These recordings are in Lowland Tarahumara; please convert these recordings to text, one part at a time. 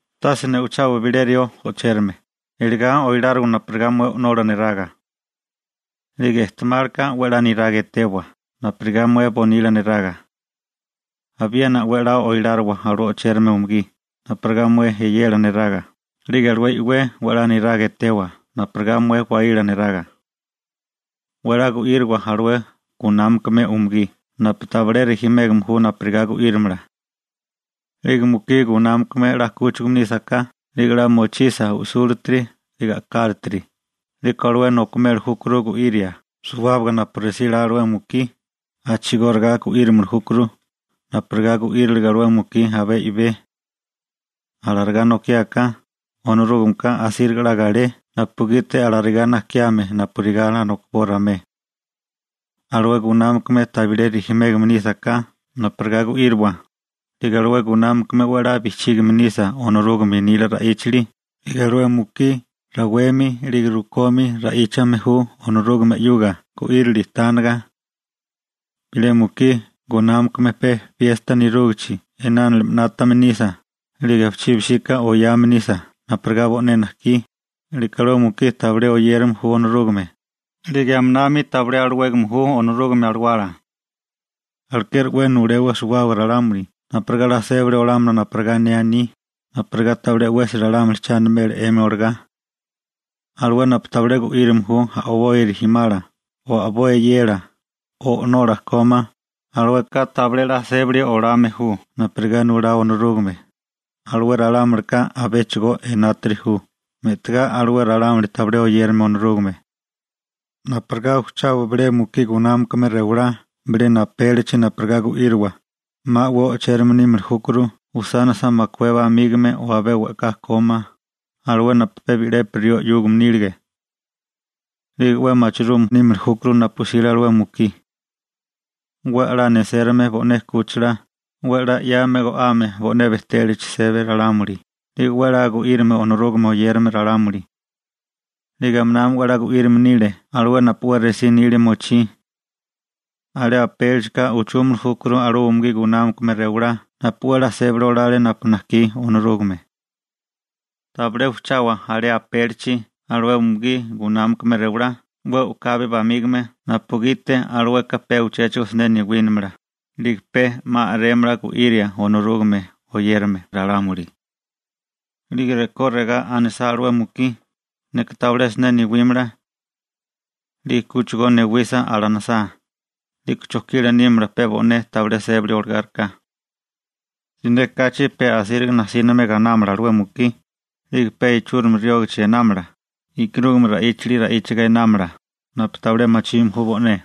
Tase ne'ochawa bilé rió o'chérame, eligá oiláriwa napurigá mué o'nola neraga. 'Lige ejtemálika 'we 'la niraga etewa napurigá mué bonila neraga. Abiena 'we 'la oiláriwa alué o'chérame umugí napurigá mué e'yela neraga, 'lige alué i'wé 'we 'la niraga etewa napurigá mué waíla neraga. 'We 'la gu'íriwa alué gunámakame umugí napu tabilé rijimégame ju napurigá gu'írimala. Bilé mukí gunámakame 'la 'kúchigame nísaká 'lige 'la mochisa u'súlatiri 'lige a'kálatiri, 'liko alué nokimeli júkuru gu'iria suwábaga napu resí 'la alué mukí, a'chigóriga gu'írimili júkuru napurigá gu'írile alué mukí abé i'bé. Alarigá nokiáká, Onorúgameka asíriga 'la galé napugiti alarigá najkiame napurigá alarigá nojkiboa ramué. Alué gunámakame tabilé rijimégame nísaká napurigá gu'íriwa, 'lige alué gunámakame 'we 'la bijchígame nisa Onorúgame nila ra'íchali 'lige alué mukí rawemi 'lige rukomi ra'íchame ju Onorúgame 'yuga gu'írili tániga. Bilé mukí gunámakame pe piesta nerúgichi inálime 'nátame nisa, 'lige abichibi 'síká oyame nisa napurigá bo'né najkí, 'liko alué mukí tabilé oyérame ju Onorúgame, 'lige aminami tabilé alawégame ju Onorúgame Alawala. Alekeri 'we nulewa suwábaga ralámuli napurigá 'la sébali olámala napu ne aní, napurigá tabilé 'wesi ralámuli cha animela 'emi olagá. Alué napu tabilé gu'írame ju a'boi rijimala o a'boi e'yela, o'nola kómá, alueka tabilé 'la sébali olame ju napurigá nulá Onorúgame, alué ralámulika abéchigo enátiri ju me'tigá alué ralámuli tabilé oyérame Onorúgame. Napurigá ujchawa bilé mukí gunámakame rewalá bilena apélichi napurigá gu'íriwa, 'ma 'we o'chérame nímili júkuru usánisa makué bamígame o abé we'ká kómá, alué napu pe bi'lepi rió 'yúgame nílige. 'Lige 'we machirume nímili júkuru napu 'sile alué mukí. 'We 'la nesérome bo'né 'kúchila, 'we 'la 'yame go'ame bo'né bejtélachi sébame ralámuli, 'lige 'we 'la gu'írame Onorúgame oyérame ralámuli. 'Lige aminami 'we 'la gu'írame nile alué napu 'we resí nilia mochí. Alé apélichika ujchúmili júkuru alué umugí gunámakame rewalá napu 'we 'la sébali olale napu najkí Onorúgame. Tabilé ujchawa alé apélichi alué umugí gunámakame rewalá 'we u'kabi bamígame napugiti alueka pe uchéchigo siné newínimala, 'lige pe 'ma a'rémala gu'iria Onorúgame oyérame ralámuli. 'Lige rekó regá anisá alué mukí: «Neka tabilé siné newímala.» 'Lige kúchigo newisa alanisá, 'liko chojkila nímala pe bo'né tabilé sébali olagáriká. Siné kachi pe asíriga najsíname ganámala alué mukí, 'lige pe ichúrimi riógichi einámala, e'karúgame ra'íchali ra'íchiga einámala, napu tabilé machime ju bo'né.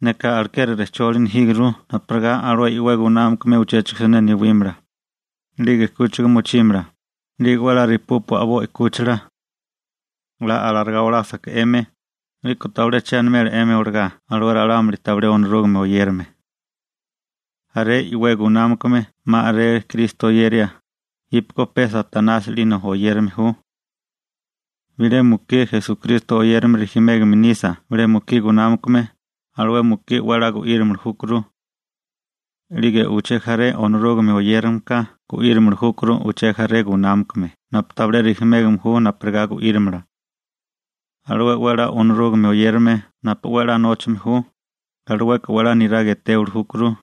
Neka alekeri rejcholi nejíguru napurigá alué i'wé gunámakame uchéchigo siné newímala, 'lige 'kúchiga mochímala, 'lige 'we 'la repúpua a'boi 'kúchila. 'La alarigá olásaká 'emi, 'liko tabilé che animela 'emi olagá alué ralámuli tabilé Onorúgame oyérame. Jaré i'wé gunámakame 'ma a'rele Kristo oyeria, jípeko pe Satanasi 'lina oyérame ju. Bilé mukí Esukristo oyérame rijimégame nisa bilé mukí gunámakame, alué mukí 'we 'la gu'írimili júkuru. 'Lige uché jaré Onorúgame oyérameka gu'írimili júkuru uché jaré gunámakame napu tabilé rijimégame ju napurigá gu'írimala. Alué e'wélala Onorúgame oyérame napu 'we 'la nóchame ju, alueka 'we 'la niraga etéwili júkuru,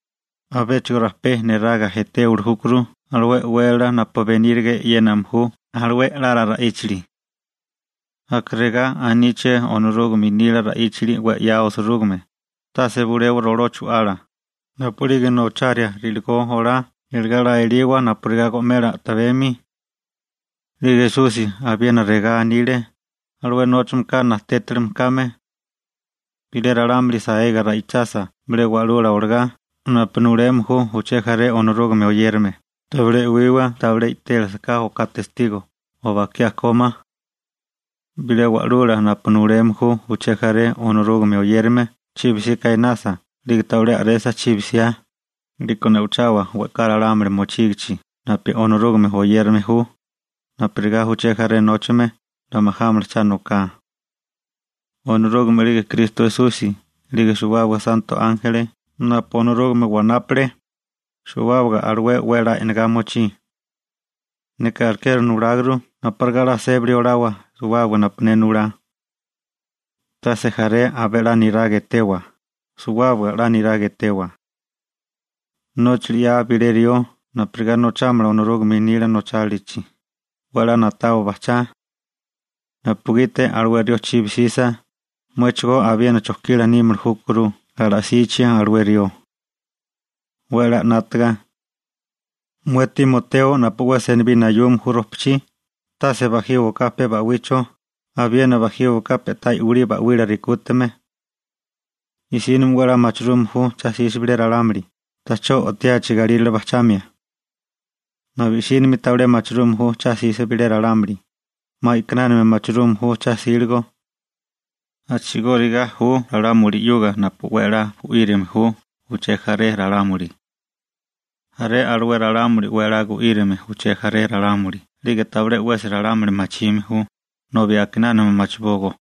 abéchigo rajpé niraga etéwili júkuru alué e'wélala napu beníriga e'yéname ju alué a'lala ra'íchali. Aka regá aníché Onorúgame nila ra'íchali 'we 'ya osirúgime: «Tase bulewa roló chu'ala napu'lige nocharia ri'ligó olá, iligá 'la eliwa napurigá go'mela a'tabemi.» 'Lige Esusi abiena regá anile: «Alué nóchameka najtétilime kame.» Bilé ralámuli saega ra'ichasa bilé wa'lula olagá napu nuleme ju uché jaré Onorúgame oyérame, tabilé e'wiwa tabilé i'télasaká oká testigo o bakiá kómá. Bilé wa'lula napu nuleme ju uché jaré Onorúgame oyérame chibi 'sika einasa 'lige tabilé a'resa chibi 'siá, 'liko ne'ochawa we'ká ralámuli mochígichi napu Onorúgame oyérame ju, napurigá uché jaré nóchame 'la majámala cha noká. Onorúgame 'lige Kristo Esusi 'lige suwábaga santo ánjeli napu Onorúgame wanápale, suwábaga alué 'we 'la e'nagá mochí. Neka alekeri nuláguru napurigá 'la sébili olawa suwábaga napu ne nulá. Tase jaré abé 'la niraga etewa, suwábaga 'la niraga etewa. Nóchali 'yaa bilé rió napurigá nochámala Onorúgame nila nochálilachi, 'we 'la na'tawa bajchá, napugiti alué rió chibi 'sisa, muéchigó abiena chojkila nímili júkuru ala'sichi alué rió. 'We a'lá 'nátaga. Mué Timoteo napu 'we senibí nayume ju rojpachí, tase bajíwaká pe ba'wicho, abiena bajíwaká pe'tá i'wilí ba'wila rekútame. I'sínimi 'we 'la machirume ju cha 'sisa bilé ralámuli ta'chó o'tiachi galírale bajchamia. Nobi i'sínimi tabilé machirume ju cha 'sisa bilé ralámuli, 'ma a'kinánami machirume ju cha 'síligo. A'chigóriga ju ralámuli 'yuga napu 'we a'lá gu'írame ju uché jaré ralámuli. Jaré alué ralámuli 'we a'lá gu'írame uché jaré ralámuli 'lige tabilé 'wesi ralámuli machime ju, nobi a'kinánami machibógó.